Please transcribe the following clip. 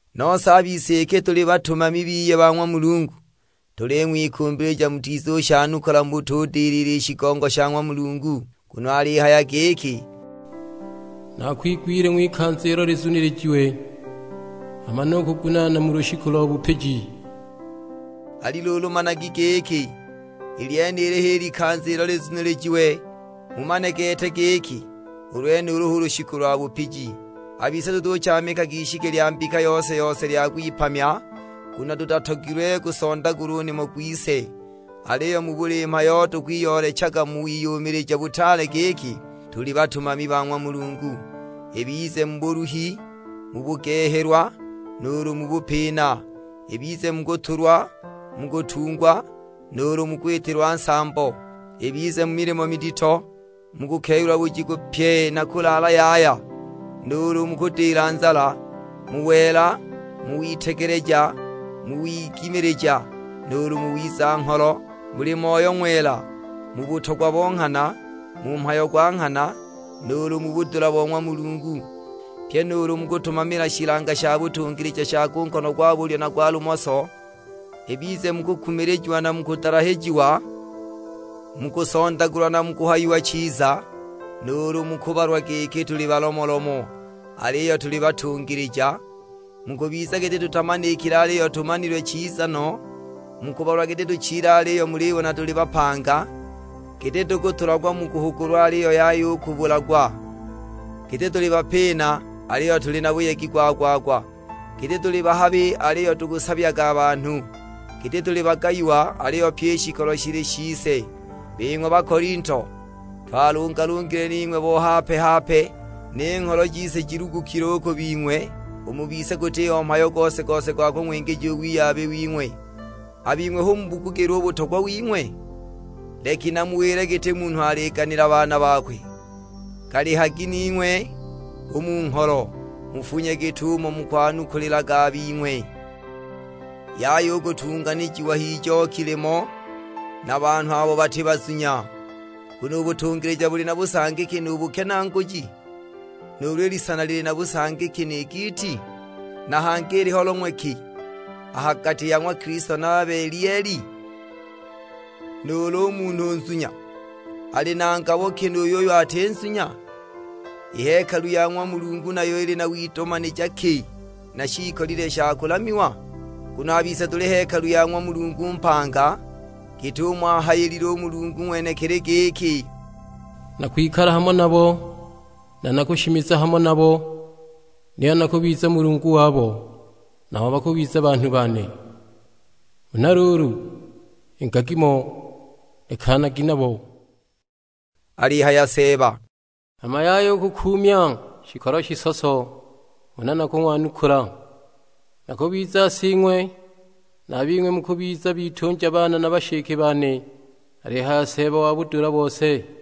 Nose a bise iki tuli batumami biye ba ng'wa Mulungu, tuling'wikumbilija mutizushanukula mu butudilila i shigongo sha ng'wa Mulungu. Nguno alihaya giki, "Naakwigwile ng'wikanza ilo lizunilijiwe, hama nukugunaana mu lushiku lo bupiji." Ali luulu managi giki, i lyenili h'i likanza ilo lizunilijiwe, mumane gete giki u lwenulu hu lushiku lwa bupiji. A bise tutuchaamikaga ishiki lya mbika yose-yose lya kwipamya, nguno tutatogilwe gusondagulwe u nimo gwise. Aliyo mu buli mhayo tukwiyoolechaga mu wiyumilija butaale giki tuli batumami ba ng'wa Mulungu; ibize mu buluhi, mu bugehelwa, nuulu mu bupina. Ibize mu kutulwa, mu kutungwa, nuulu mu kwitilwa nsambo; ibize mu milimo midito, mu kukeyula bujiku pye na kulaala yaya, nuulu mu kudila nzala. Mu wela, mu witegeleja, mu wigimilija, nuulu mu wiza-ngholo. Muli Moyo Ng'wela, mu butogwa bo nghana, mu mhayo gwa nghana, nuulu mu budula bo ng'wa Mulungu. Pye nuulu mu kutumamila shilanga sha butungilija sha ku nkono gwa bulyo na gwa lumoso. Ibize mu kukumilijiwa na mu kudalahijiwa, mu kusondagulwa na mu kuhayiwa chiza, nuulu mu kubalwa giki tuli balomolomo, aliyo tuli batungilija. Mu kubiza giti tutamanikile aliyo tumanilwe chiza no, mu kubalwa giti tuchile aliyo mulibona tuli bapanga, giti tukutulagwa mu kuhugulwa aliyo yaya u kubulagwa. Giti tuli bapina aliyo tuli na buyegi gwa-gwa-gwa, giti tuli bahabi aliyo tukusabyaga banhu, giti tuli bagayiwa aliyo pyi i shikolo shili shise. Bing'we Bakolinto, twalungalungile ning'we bo hape-hape, ni ngholo jise jilugukile u ku bing'we. U mu bise gutiho mhayo gose-gose gwa kung'wingija u wiyabi wing'we; a bing'we hu mubugugile u butogwa wing'we? Leki namuwile giti munhu aliganila baana bakwe; galihagi ning'we u mu ngholo, mufunye git'umo mukwanukulilaga a bing'we! Yaya u kutunganijiwa h'ijoki limo na banhu abo bati bazunya; nguno u butungilija buli na busangi ki nu bukenaaguji? Nuulu i lisana lili na busangi ki ni giiti? Na hangi iliho long'we ki a ha gati ya ng'wa Kilisto na Belieli? Nuulu u munhu u nzunya ali na ngabo ki nu yuyo ati nzunya? I hekalu ya ng'wa Mulungu nayo ili na widomanija ki na shiikolile sha kulamiwa? Nguno a bise tuli hekalu ya ng'wa Mulungu mpanga; git'umo ahayilile u Mulungu ng'wenekili; giki, "Nakwikala hamo nabo, na nakushimiza hamo nabo, niyo nakubiza Mulungu wabo, nabo bakubiza banhu bane. Huna luulu ingagi mo, lekanagi nabo," alihaya Seeba; "hama yaya u kukuumya shikolo shisoso, huna nakung'wanukula. Nakubiza Sing'we, na a bing'we mukubiza bitunja bane na bashike bane; alihaya Seeba wa budula bose."